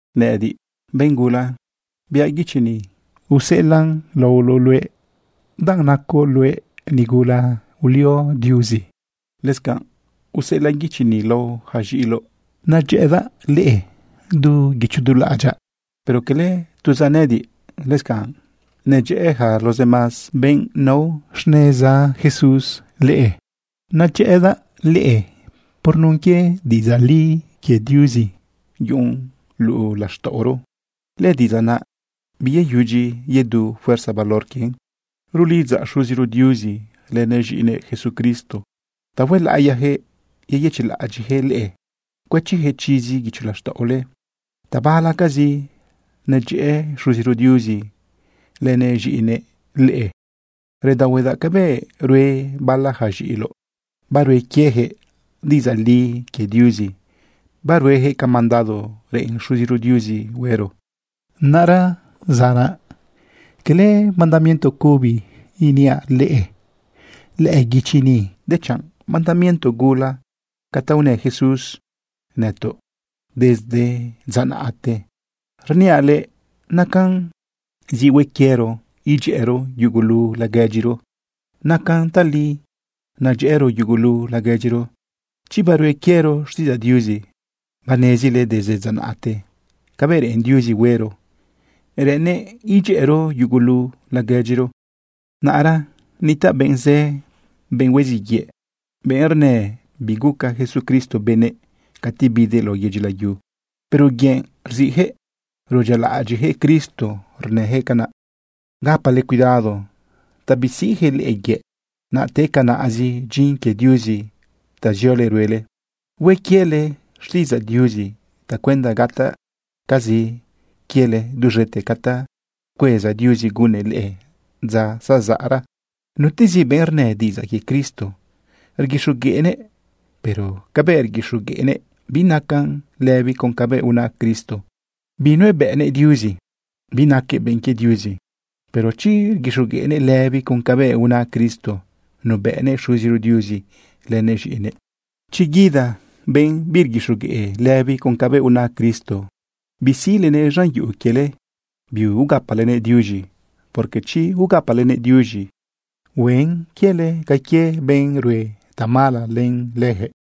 Nëꞌëdiꞌ, benꞌ gula, biaꞌ guichi ni, useꞌelaꞌn laoloꞌ luëꞌ danꞌ nacoꞌ luëꞌ nigula ulio Diuzi. Lëscanꞌ useꞌelaꞌ guichi ni lao ja z̃iꞌiloꞌ. Nadyëꞌëdaꞌ leꞌe du guicho du laꞌadyaꞌ. Pero cala tuzaꞌ nëꞌëdiꞌ, lëscanꞌ nadyëꞌë yaca los demás benꞌ nao xneza Jesús leꞌe. Nadyëꞌëdaꞌ leꞌe por nun quie diꞌidzaꞌ li quie Diuzi yuꞌun luꞌu laxtaꞌoro. Lëdiꞌidzaꞌ naꞌ biyeyudyi yedu fuerza valor quien. Rulidzaꞌ Xuziro Diuzi lënëꞌ z̃iꞌinëꞌ Jesucristo ta huelaꞌiyajëꞌ yeyëchiꞌlaꞌadyiꞌjëꞌ leꞌe, cuëchijëꞌ chizi guicho laxtaꞌole. Tabalacazi nedyëꞌë Xuziro Diuzi lënëꞌ z̃iꞌinëꞌ leꞌe. Redaohuedaꞌ cabëꞌ rue bala ja z̃iꞌiloꞌ, barue quieyaquëꞌ diꞌidzaꞌ li quie Diuzi, barueyaquëꞌ ca mandado reꞌen Xuziro Diuzi huero. Naꞌra zanaꞌ, quele mandamiento cubi iniaꞌ leꞌe lëꞌë guichi ni, dechanꞌ mandamiento gula ca ta unë Jesús nëtoꞌ desde dza naꞌte. Rniaꞌ leꞌe nacan zi hue quiero idyëꞌëro yugulu laguedyiro. Nacan tali nadyëꞌëro yugulu laguedyiro, chi barue quiero xtiꞌidzaꞌ Diuzi. Banezile desde dza naꞌte cabëꞌ reꞌen Diuzi huero, reꞌennëꞌ idyëꞌëro yugulu laguedyiro. Naꞌra nitaꞌ benꞌ zë, benꞌ hueziꞌ yëꞌ, benꞌ rnë biguca Jesucristo benëꞌ cati bidëꞌ lao yedyi layu. Pero yëꞌ rziꞌjëꞌ, rudyialaꞌadyiꞌjëꞌ Cristo rnëjëꞌ canaꞌ. Gapale cuidado ta bisiꞌjëꞌ leꞌe yëꞌ, naꞌ te canaꞌzi dyin quie Diuzi ta ziole ruele. Hue quiele xtiꞌidzaꞌ Diuzi tacuenda gataꞌcazi quiele duz̃ete ca ta pcueza Diuzi gunnëꞌ leꞌe dza zazaꞌra. Nutezi benꞌ rnë diꞌidzaꞌ quie Cristo rguixogueꞌnëꞌ, pero cabëꞌ rguixogueꞌnëꞌ binacan lëbi con cabëꞌ una Cristo, binubëꞌnëꞌ Diuzi, binaquëꞌ benꞌ quie Diuzi. Pero chi rguixogueꞌnëꞌ lëbi con cabëꞌ una Cristo, nubëꞌnëꞌ Xuziro Diuzi lënëꞌ z̃iꞌinëꞌ. Chi guida benꞌ birguixogueꞌ lëbi con cabëꞌ una Cristo, bisiꞌlenëꞌ z̃an yuꞌu quiele, biugapalenëꞌ diuz̃i, porque chi ugapalenëꞌ diuz̃i, huen quiele ca quie benꞌ rue tamala len leyaquëꞌ.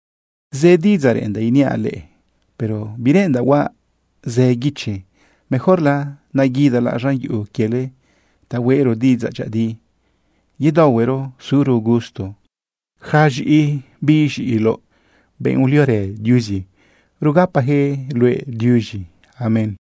Zë diꞌidzaꞌ reꞌendaꞌ iniaꞌ leꞌe, pero bireꞌendaꞌ huaꞌ zë guichi. Mejorla naguidalaꞌ z̃an yuꞌu quiele ta hueꞌro diꞌidzaꞌ dyëꞌëdi, yedaohuero suro gusto. Yaca z̃iꞌi biꞌ z̃iloꞌ, benꞌ uliorë Diuzi, rugapajëꞌ luëꞌ diuz̃i. Amén.